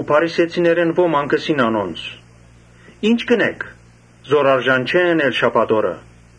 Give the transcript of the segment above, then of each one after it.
Փարիսեցիներէն ոմանք ըսին անոնց. «Ի՞նչ կ’ընէք, չէ՞ որ արգիլուած է գործել շաբաթ օրը»։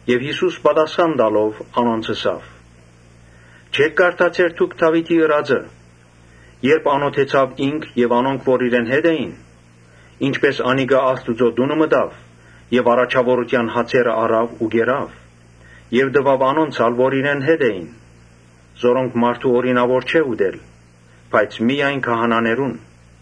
Յիսուս պատասխան տալով՝ ըսաւ անոնց. «Չէ՞ք կարդացեր դուք Դաւիթին ըրածը, երբ անօթեցան ինք եւ անոնք որ իրեն հետ էին։ Ի՛նչպէս անիկա Աստուծոյ տունը մտաւ եւ առաջաւորութեան հացերը առաւ ու կերաւ եւ տուաւ անոնց ալ որ իրեն հետ էին. որոնք ուրիշ մարդո՛ւ օրինաւոր չէր ուտել, բայց միայն քահանաներուն»։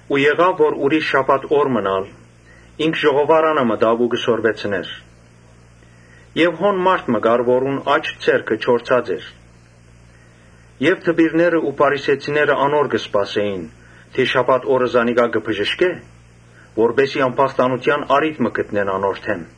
Ուրիշ շաբաթ օր մըն ալ ինք ժողովարանը մտաւ ու կը սորվեցնէր։ Հոն մարդ մը կար, որուն աջ ձեռքը չորցած էր։ Դպիրներն ու փարիսեցիները անոր կը սպասէին՝ տեսնելու թէ շաբաթ օրը զանիկա պիտի բժշկէ՞, որպէս զի ամբաստանութեան առիթ մը գտնեն անոր դէմ։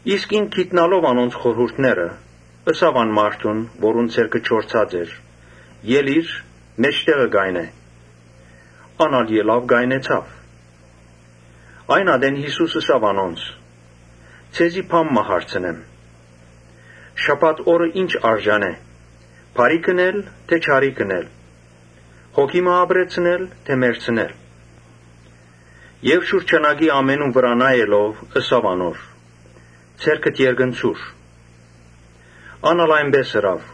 Իսկ ինք գիտնալով անոնց խորհուրդները, ըսաւ այն մարդուն, որուն ձեռքը չորցած էր. «Ելի՛ր, մէջտեղը կայնէ»։ Ան ալ ելաւ կայնեցաւ։ Այն ատեն Յիսուս ըսաւ անոնց. «Ձեզի բան մը հարցնեմ. ‘Շաբաթ օրը ո՞րը յարմար է. բարի՞ք թէ չարիք ընելը, հոգի մը ապրեցնե՞լը թէ մեռցնելը’»։ Եւ շուրջանակի ամենուն վրայ նայելով՝ ըսաւ անոր. «Ձեռքդ երկնցուր»։ Ան ալ այնպէս ըրաւ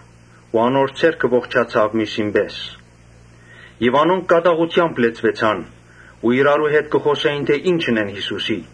ու անոր ձեռքը ողջնցաւ միւսին պէս։ Անոնք կատաղութեամբ լեցուեցան ու իրարու հետ կը խօսէին թէ՝ ի՞նչ ընեն Յիսուսին։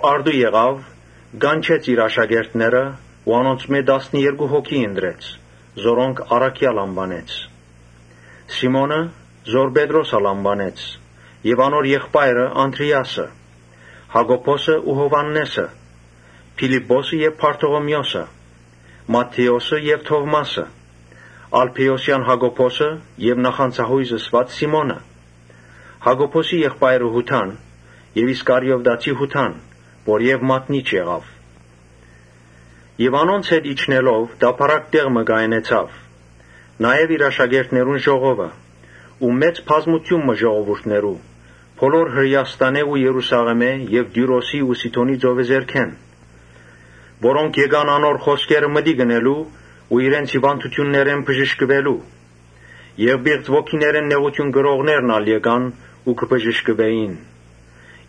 Առտուն կանչեց իր աշակերտները ու անոնցմէ տասներկու հոգի ընտրեց ու զանոնք առաքեալ անուանեց. Սիմոնը՝ որ Պետրոս ալ անուանեց եւ անոր եղբայրը Անդրէասը, Յակոբոսը ու Յովհաննէսը, Փիլիպպոսը, Բարթողիմէոսը, Մատթէոսը եւ Թովմասը, Ալփէոսեան Յակոբոսը եւ Նախանձայոյզ ըսուած Սիմոնը, Յակոբոսին եղբայրը Յուդան եւ Իսկարիովտացի Յուդան, որը մատնիչ եղաւ։ Անոնց հետ իջնելով՝ տափարակ տեղ մը կայնեցաւ, նաեւ իր աշակերտներուն ժողովը՝ ու մեծ բազմութիւն մը ժողովուրդներու՝ բոլոր Հրէաստանէն ու Երուսաղէմէն եւ Տիւրոսի ու Սիդոնի ծովեզերքէն. Որոնք եկան անոր խօսքերը մտիկ ընելու ու իրենց հիւանդութիւններէն բժշկուելու եւ պիղծ ոգիներէն նեղութիւն կրողներն ալ եկան ու բժշկուեցան։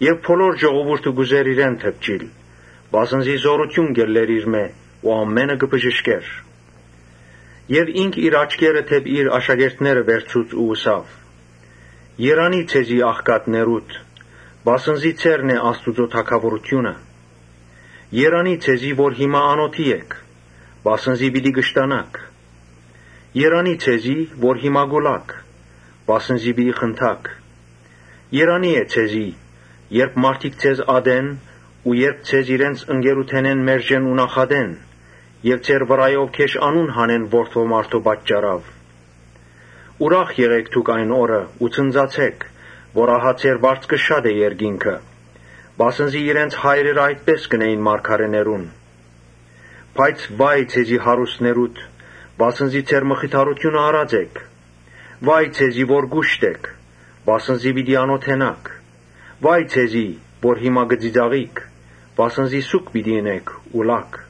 Եւ բոլոր ժողովուրդը կ’ուզէր իրեն դպչիլ, վասն զի զօրութիւն կ’ելլէր իրմէ ու ամէնքը կը բժշկէր։ Ինք իր աչքերը դէպի իր աշակերտները վերցուց ու ըսաւ. «Երանի՜ ձեզի աղքատներուդ, վասն զի ձերն է Աստուծոյ թագաւորութիւնը։ Երանի՜ ձեզի որ հիմա անօթի էք, վասն զի պիտի կշտանաք։ Երանի՜ ձեզի որ հիմա կու լաք, վասն զի պիտի խնդաք։ Երանի՜ ձեզի՝ երբ մարդիկ ձեզ ատեն ու երբ ձեզ իրենց ընկերութենէն մերժեն ու նախատեն եւ ձեր վրայով գէշ անուն հանեն Որդի մարդոյ պատճառով»։ «Ուրախ եղէք դուք այն օրը ու ցնծացէք, քանզի ձեր վարձքը շատ է երկինքը. վասն զի իրենց հայրերը այդպէս կ’ընէին մարգարէներուն։ Բայց վա՜յ ձեզի հարուստներուդ, վասն զի ձեր մխիթարութիւնը առած էք։ Վա՜յ ձեզի որ կուշտ էք, վասն զի պիտի անօթենաք. վա՜յ ձեզի որ հիմա կը ծիծաղիք, վասն զի սուգ պիտի ընէք ու լաք։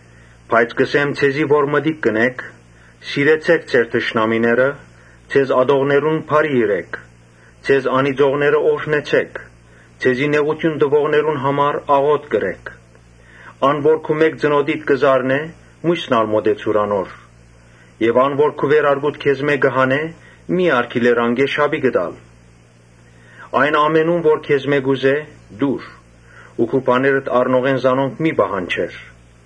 Բայց կ’ըսեմ ձեզի որ մտիկ կ’ընէք. «Սիրեցէք ձեր թշնամիները, ձեզ ատողներուն բարիք ըրէք, Ձեզ անիծողները օրհնեցէք, ձեզի նեղութիւն տուողներուն համար աղօթք ըրէք։ Թէ որ մէկը քու ծնօտիդ զարնէ, միւսն ալ մօտեցուր անոր. եթէ ան քու վերարկուդ քեզմէ հանէ, մի՛ արգիլեր անկէ շապիկդ ալ։ Ամէն ինչ, որ քեզմէ կ’ուզէ՝ տուր ու քու բաներդ առնողէն զանոնք մի՛ պահանջեր։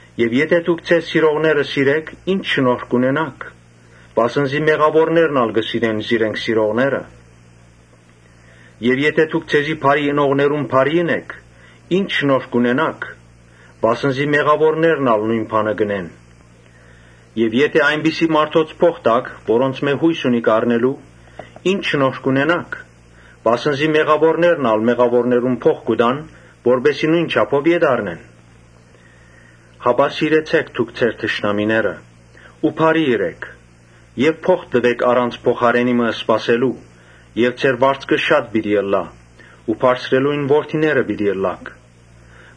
Եթէ դուք ձեզ սիրողները սիրէք, ի՞նչ շնորհք կ’ունենաք. վասն զի մեղաւորներն ալ կը սիրեն զիրենք սիրողները։ Եթէ դուք ձեզի բարիք ընողներուն բարիք ընէք, ի՞նչ շնորհք կ’ունենաք. վասն զի մեղաւորներն ալ նոյն բանը կ’ընեն։ Եթէ այնպիսի մարդոց փոխ տաք՝ որոնցմէ յոյս ունիք ետ առնելու. ի՞նչ շնորհք կ’ունենաք. վասն զի մեղաւորներն ալ մեղաւորներուն փոխ կու տան, որպէս զի նոյն չափով ետ առնեն։ Այլ սիրեցէք դուք ձեր թշնամիները ու բարիք ըրէք եւ փոխ տուէք առանց փոխարէնը բան մը սպասելու եւ ձեր վարձքը շատ պիտի ըլլայ ու Բարձրեալին որդիները պիտի ըլլաք,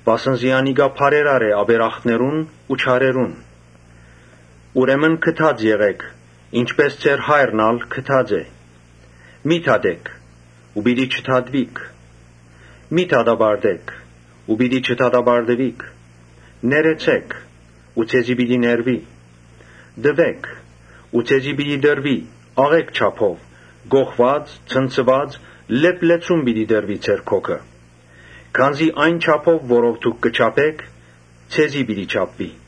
վասն զի անիկա բարերար է ապերախտներուն ու չարերուն։ Ուրեմն գթած եղէք, ինչպէս ձեր Հայրն ալ գթած է»։ «Մի՛ դատէք ու պիտի չդատուիք։ Մի՛ դատապարտէք ու պիտի չդատապարտուիք։ Ներեցէ՛ք ու ձեզ պիտի ներուի։ Տուէ՛ք ու ձեզ պիտի տրուի։ Աղէկ չափով՝ կոխուած, ցնցուած, լեփլեցուն պիտի տրուի ձեր գոգը. քանզի այն չափով՝ որով դուք կը չափէք, ձեզի պիտի չափուի»։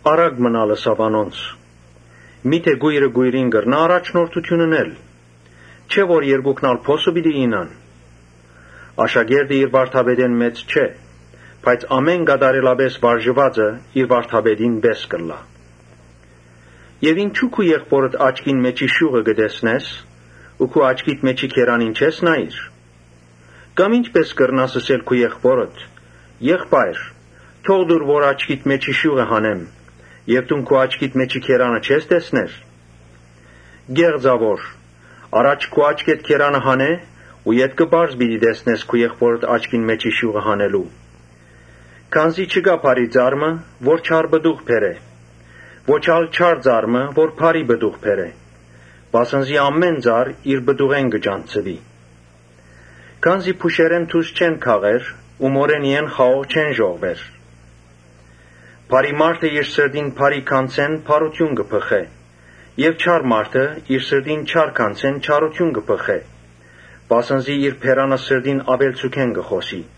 Առակ մըն ալ ըսաւ անոնց. «Միթէ կոյրը կոյրին կրնա՞յ առաջնորդութիւն ընել. չէ՞ որ երկուքն ալ փոսը պիտի իյնան։ Աշակերտը իր վարդապետէն մեծ չէ, իսկ ամէն կատարելապէս վարժուածը իր վարդապետին պէս կրնայ ըլլալ»։ «Ինչո՞ւ քու եղբօրդ աչքին մէջի շիւղը կը տեսնես ու քու աչքիդ մէջի գերանին չես նայիր։ Կամ ի՞նչպէս կրնաս ըսել քու եղբօրդ. ‘Եղբա՛յր, թող տուր որ աչքիդ մէջի շիւղը հանեմ’ եւ դուն քու աչքիդ մէջի գերանը չես տեսներ։ Կե՛ղծաւոր, առաջ քու աչքէդ գերանը հանէ ու ետքը պարզ պիտի տեսնես քու եղբօրդ աչքին մէջի շիւղը»։ «Չկայ բարի ծառ մը, որ չար պտուղ բերէ, ո՛չ ալ չար ծառ մը, որ բարի պտուղ բերէ. Վասն զի ամէն ծառ իր պտուղէն կը ճանչցուի։ Քանզի փուշերէն թուզ չեն քաղեր ու մորենիէն խաղող չեն ժողվեր։ Բարի մարդը իր սրտին բարի գանձէն բարութիւն կը բղխեցնէ եւ չար մարդը իր սրտին չար գանձէն չարութիւն կը բղխեցնէ. վասն զի բերանը սրտին աւելցուքէն կը խօսի»։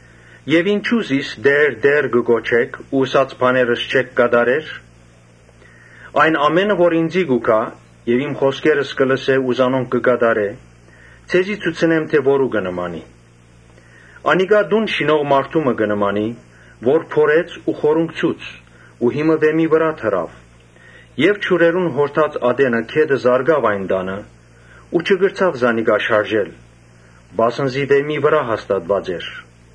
«Ինչո՞ւ զիս Տէ՛ր, Տէ՛ր, կը կոչէք ու ըսած բաներս չէք կատարեր։ Այն, որ ինծի կու գայ եւ իմ խօսքերս կը լսէ ու զանոնք կը կատարէ, ձեզի ցուցնե՞մ թէ որու կը նմանի։ Անիկա տուն շինող մարդու մը կը նմանի, որ փորեց ու խորունկցուց ու հիմը վէմի վրայ դրաւ եւ ջուրերուն յորդած ատենը գետը զարկաւ այն տանը ու չկրցաւ զանիկա շարժել, վասն զի վէմի վրայ հաստատուած էր։